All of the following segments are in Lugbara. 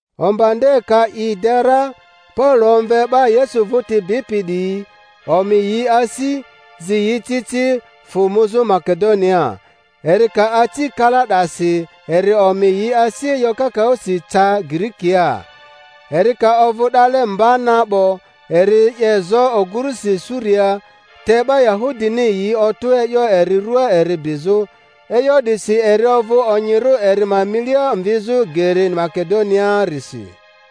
Omba nde ka i de ra, Paulo omve 'ba Yesu vᴜti bipi 'diyi, omi yi asi, zi yi ci ci, fᴜ muzᴜ Makedoniaa. Eri ka aci kala 'dasi eri omi yi asi e'yo kakaᴜsi, ca Girikia. Eri ka ovᴜ 'dale mba na 'bo, eri 'ye zo ogurusi Suriaa, te 'ba Yahudini yi otᴜ e'yo eri ruaa eri bizᴜ, e'yo 'disi eri ovᴜ onyirᴜ eri ma milia mvizᴜ geri Makedoniaarisi.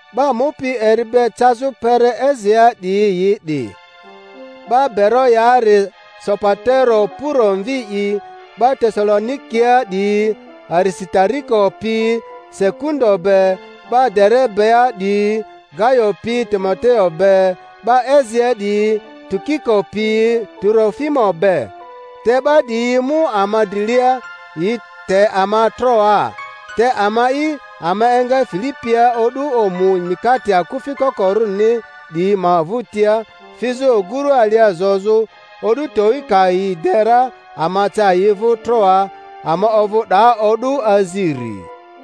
'Ba mupi eri be cazᴜ kpere Asiaa 'diyi yi 'di: 'ba Beroyaari Sopatero Puro mvi'i, 'ba Tesalonikia 'diyi Arisitariko pi Sekundo be, 'ba Derebea 'diyi Gayo pi Timoteo be, 'ba Asiaa 'diyi Tukiko pi Turofimo be. Te 'ba 'diyi mu ama drilia, yi te ama Troaa; te ama'i, ama enga Filipia o'du omu Mikate Akufi Kokorᴜrini 'diyi ma vᴜtia, fizᴜ oguru alia zozᴜ; o'du towi ka yi de ra ama ca yi vᴜ Troaa, ama ovᴜ 'daa o'du aziri.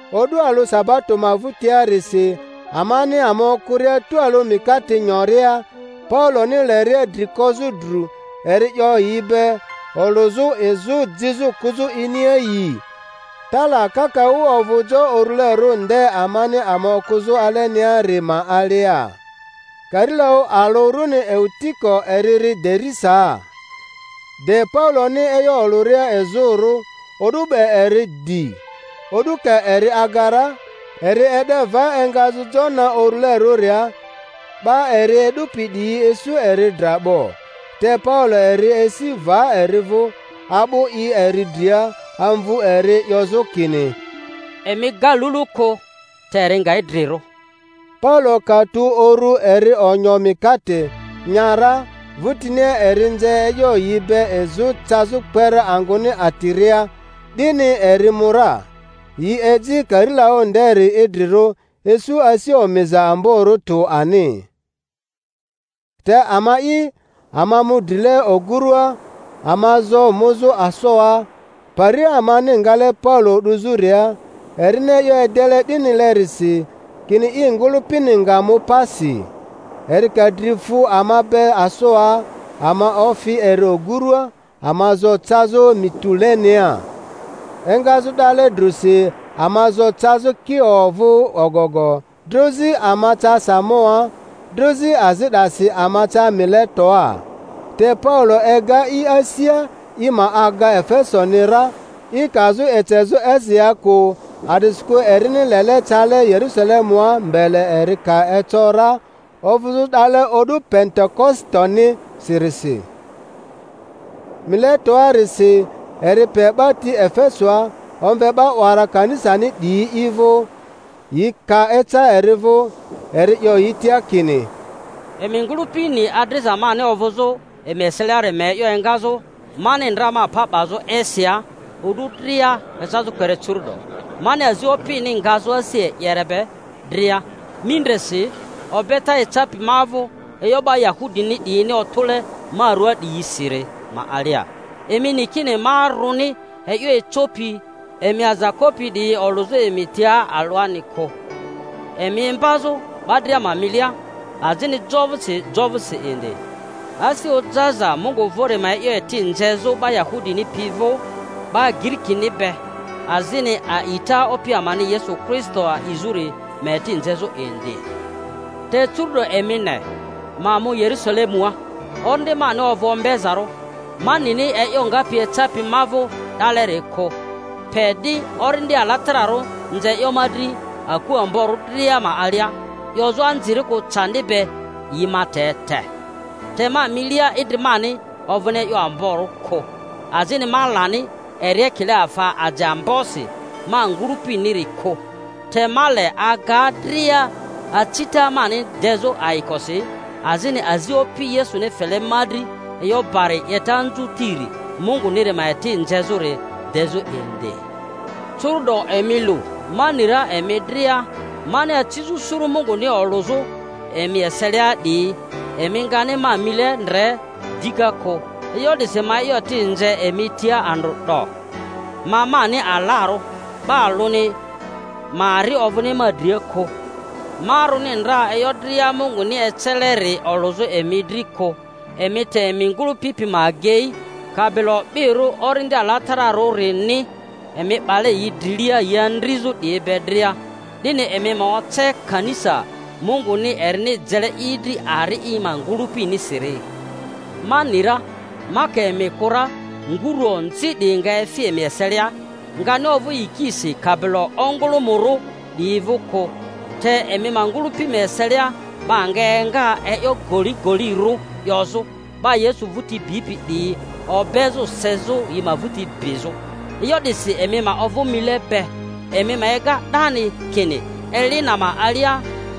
O'du alᴜ sabato ma vᴜtiarisi, amani ama okᴜria tualᴜ mikate nyoria, Pauloni leria dri kozᴜ dru, eri 'yo yi be, olᴜzᴜ izᴜ jizᴜ kᴜzᴜ iniaayii. Tala kakaᴜ ovᴜ jo urulerᴜ nde amani ama okᴜzᴜ aleniari ma alia. Karilaᴜ alᴜ runi Eutiko eri ri derisaa. De Pauloni e'yo olᴜria izᴜrᴜ, o'du 'be eri dii; o'du ka eri aga ra, eri e'de va engazᴜ jo na urulerᴜria, 'ba eri e'dupi 'diyi isu eri dra 'bo. Te Paulo eri esi va eri vᴜ, a'bu i eri dria, amvu eri, 'yozᴜ kini, Emi ga lulu kᴜ, te eri nga idrirᴜ. Paulo ka tu uru eri onyo mikate, nya ra, vᴜtinia eri nze e'yo yi be izᴜ cazᴜ kpere angᴜni atiria, 'dini eri mu ra. Yi eji karilaᴜ nderi idrirᴜ, isu asi omiza amborᴜ tᴜ ani. Te ama'i, ama mu drile ogurᴜa, ama zo muzᴜ Asoa, pari amani ngale Paulo 'duzᴜria; erini e'yo edele 'dinilerisi, kini i ngᴜlᴜpini nga mu pasi. Eri ka dri fu ama be Asoa, ama ofi eri ogurᴜa, ama zo cazᴜ Mitulenea. Engazᴜ 'dale drᴜsi ama zo cazᴜ Kio vᴜ ogogo; drozi ama ca Samoa; drozi azi 'dasi ama ca Miletoa. Te Paulo ega i asia i ma aga Efesoni ra, i kazᴜ ecezᴜ Asiaa kᴜ; a'disikᴜ erini lele cale Yerᴜsalemua mbele eri ka eco ra, ovᴜzᴜ 'dale o'du Pentekositoni-sirisi. Miletoarisi eri pe 'ba ti Efesoa, omve 'ba 'wara kanisani 'diyi i vᴜ. Yi ka eca eri vᴜ, eri 'yo yi tia kini: Emi ngᴜlᴜpi ni adriza mani ovᴜzᴜ emi eseliari ma e'yo engazᴜ mani ndra ma pa 'bazᴜ Asiaa o'du dria ecazᴜ kpere curu'do, mani azi Opmi ngazᴜ asi e'yere be dria, mindresi, obeta ecapi ma vᴜ e'yo 'ba Yahudini 'diyini otᴜle ma ruaa 'diyisiri ma alia; emi ni kini ma rᴜni e'yo ecopi emi aza kopi 'diyi olᴜzᴜ emi tia alᴜani kᴜ, emi imbazᴜ 'ba dria ma milia azini jo vᴜsi jo vᴜsi indi, asi ojaza Mungu vᴜri ma e'yo eti nzezᴜ 'ba Yahudini pi vᴜ, 'ba Giirikini be, azini a'ita Opi amani Yesu Kristo a'izᴜri ma eti nzezᴜ indi. Te curu'do emi ne, ma mu Yerusale-mua, orindi mani ovᴜ ombezarᴜ, ma nini e'yo ngapi ecapi ma vᴜ 'daleri kᴜ; pe 'di, Orindi Alatararᴜ nze e'yo ma dri aku amborᴜ dria ma alia, 'yozᴜ anzirikᴜ candi be yi ma te te. Te ma milia idri mani ovᴜni e'yo amborᴜ kᴜ, azini ma lani eri ekile afa ajeambosi ma ngᴜlᴜ-piniri kᴜ, te ma le aga dria acita mani dezᴜ ayikosi, azini azi Opi Yesuni fele ma dri e'yo bari 'yeta anzᴜtiri Munguniri ma eti nzezᴜri dezᴜ indi. Curu'do emi lu, ma ni ra emi dria mani acizᴜ suru Munguni olᴜzᴜ emi eselia 'diyi, emi ngani ma mile ndre dika kᴜ. E'yo 'disi ma e'yo eti nze emi tia andrᴜ 'do, ma mani alarᴜ, 'ba alᴜni ma ari ovᴜni ma dria kᴜ, ma rᴜni ndra e'yo dria Munguni eceleri olᴜzᴜ emi dri kᴜ. Emi te emi ngᴜlᴜpi pi ma agei, kabilo o'birᴜ Orindi Alatara-rᴜrini emi 'bale yi drilia yi andrizᴜ 'diyi be dria, 'dini emi ma oce kanisa Munguni erini jele i dri ari i ma ngᴜlᴜpinisiri. Ma ni ra, ma ka emi kᴜ ra nguru onzi 'diyi nga efi emi eselia, ngani ovᴜ yikisi kabilo ongᴜlᴜmᴜrᴜ 'diyi vᴜ kᴜ; te emi ma ngᴜlᴜpi ma eselia 'ba nga enga e'yo goligolirᴜ 'yozᴜ, 'ba Yesu vᴜti bipi 'diyi obezᴜ sezᴜ yi ma vᴜti bizᴜ. E'yo 'disi emi ma ovᴜ mile be, emi ma ega 'dani kini eli na ma alia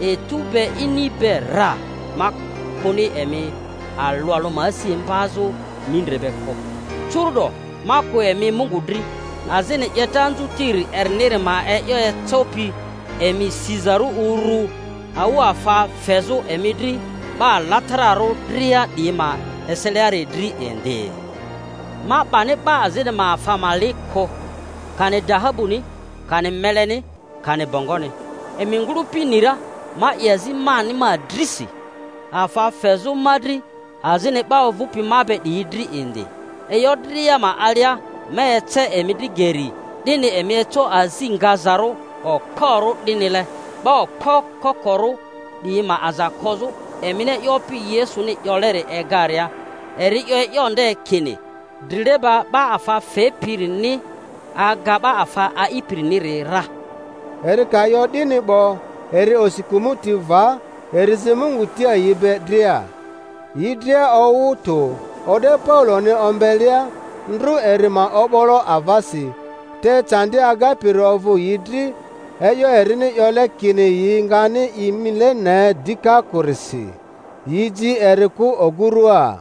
etu be ini be rra ma kᴜni emi alᴜ alᴜ ma asi imbazᴜ mindre be kᴜ. Curu'do ma kᴜ emi Mungu dri, azini 'yeta anzutiri eriniri ma e'yo ecopi emi sizarᴜ urᴜ awᴜafa fezᴜ emi dri 'ba alatararᴜ dria 'diyi ma eseliari dri indi. Ma 'bani 'ba azini ma afa ma li kᴜ, kani dahabuni, kani meleni, kani bongoni. Emi ngᴜlᴜpi ni ra ma 'ye azi mani ma drisi, afa fezᴜ ma dri azini 'ba ovᴜpi ma be 'diyi dri indi. E'yo dria ma alia ma ece emi dri geri, 'dini emi eco azi ngazarᴜ okporᴜ 'dinile 'ba okpo kokorᴜ 'diyi ma aza kozᴜ, emini e'yo Opi Yesuni 'yoleri egaria; eri 'yo e'yo nde kini, Drileba 'ba afa fepirini aga 'ba afa a'ipiriniri ra. Eri ka 'yo 'dini 'bo, eri osi kᴜmᴜti va, eri zi Mungu tia yi be dria. Yi dria owᴜ tᴜ, o'de Pauloni ombelea, ndrᴜ eri ma o'bolo avasi, te candi agapiri ovᴜ yi dri e'yo erini 'yole kini yi ngani i mile ne dika kᴜrisi. Yi ji eri kᴜ ogᴜrua.